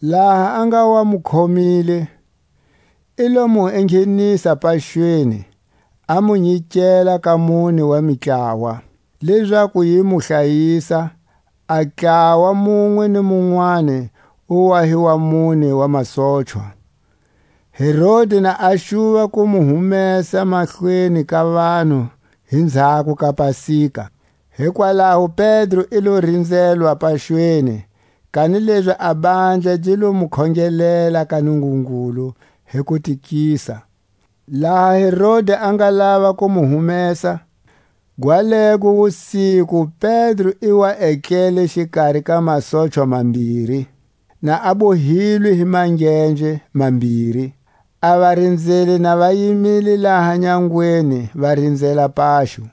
Laha a nga wa mu khomile, i lo mu enghenisa paxweni, a mu nyikela ka mune wa mitlawa, lezaku yi mu hlayisa, a ntlawa munwe ni munwani wu wa hi wa mune wa masochwa; Herodi na a xuva ku mu humesa mahlweni ka vanhu hi nzhako ka Pasika. Hikwalaho Pedro i lo rinzelwa paxweni; kanilezi a handla gi lo mu khongelela ka Nungungulu hi kutikisa. Laha Herodi a nga lava ku mu humesa, gwalego wusiku Pedro i wa etlele xikari ka masochwa mambiri, na a bohilwe hi mangenje mambiri; a varinzeli na va yimile laha nyangweni va rinzela paxo.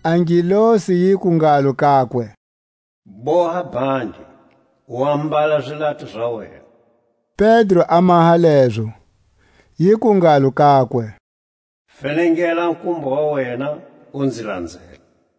A ngelosi yiku ngalo kakwe: Boha bhandi, u ambala zilato za wena. Pedro a maha lezo. Yiku ngalo kakwe: Fenengela kumba wa wena, u nzi lanzela.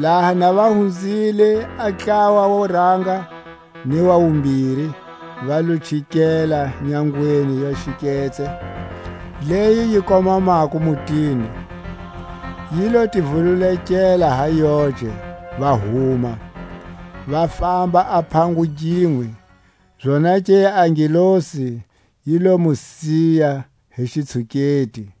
Laha na va hunzile a ntlawa wo ranga ni wa wumbiri, va lo chikela nyangweni ya xiketse leyi yi komamako mutini; yi lo ti vululekela ha yoce, va huma, va famba a phango ginwe; zonake a ngelosi yi lo mu siya hi xitshuketi.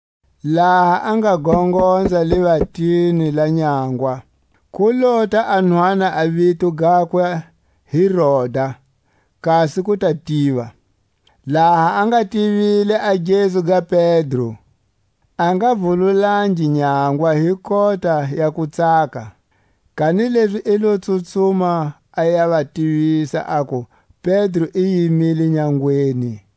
Laha a nga gongonza livatini la nyangwa, ku lota a nhwana, a vito gakwe hi Roda, kasi ku ta tiva. Laha a nga tivile a gezu ga Pedro, a nga vululangi nyangwa hi kota ya kutsaka, kanilezi i lo tsutsuma a ya va tivisa aku Pedro i yimile nyangweni.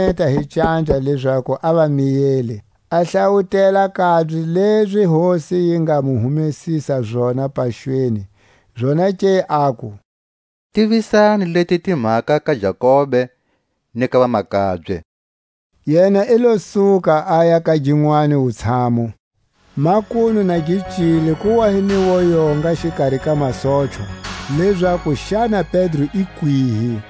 Kanilezi yena i lo va khweneta hi canja lezaku a va miyele, a hlawutela kabye lezi Hosi yi nga mu humesisa zona paxweni; zonake aku: Tivisani leti timhaka ka Jakobe ni ka vamakabye. Yena i lo suka, aya ka ginwani wutshamu. Makunu na gi cile, ku wa hi ni woyonga xikari ka masochwa, lezaku xana Pedro i kwihi.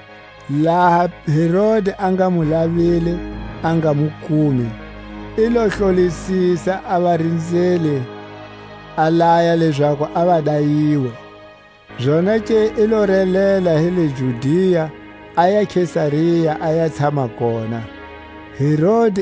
Laha Herodi a nga mu lavile, a nga mu kumi, i lo hlolisisa a varinzeli, a laya lezaku a va dayiwe. Zonake i lo relela hi le Judia aya Kesaria, a ya tshama kona. A kufa ka Herodi.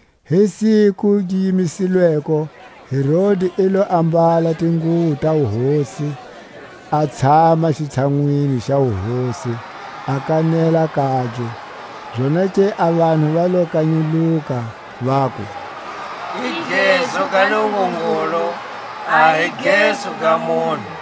Hi siku gi yimisilweko Herodi i lo ambala tinguwo ta wuhosi, a tshama xitshanwini xa wuhosi, a kanela kabye. Zonake a vanhu va lo kanyuluka, vaku: I gezu ga nungungulu, a hi gezu ga munhu!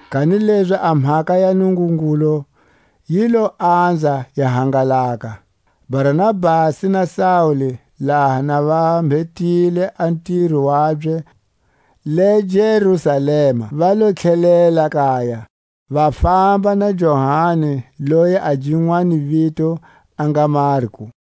Kanilezi a mhaka ya Nungungulu yi lo anza yi hangalaka. Barnabasi na Saule laha na va mbhetile a ntiro wabye le Jerusalema va lo tlhelela kaya, va famba na Johani loyi a ginwani vito a nga Marku.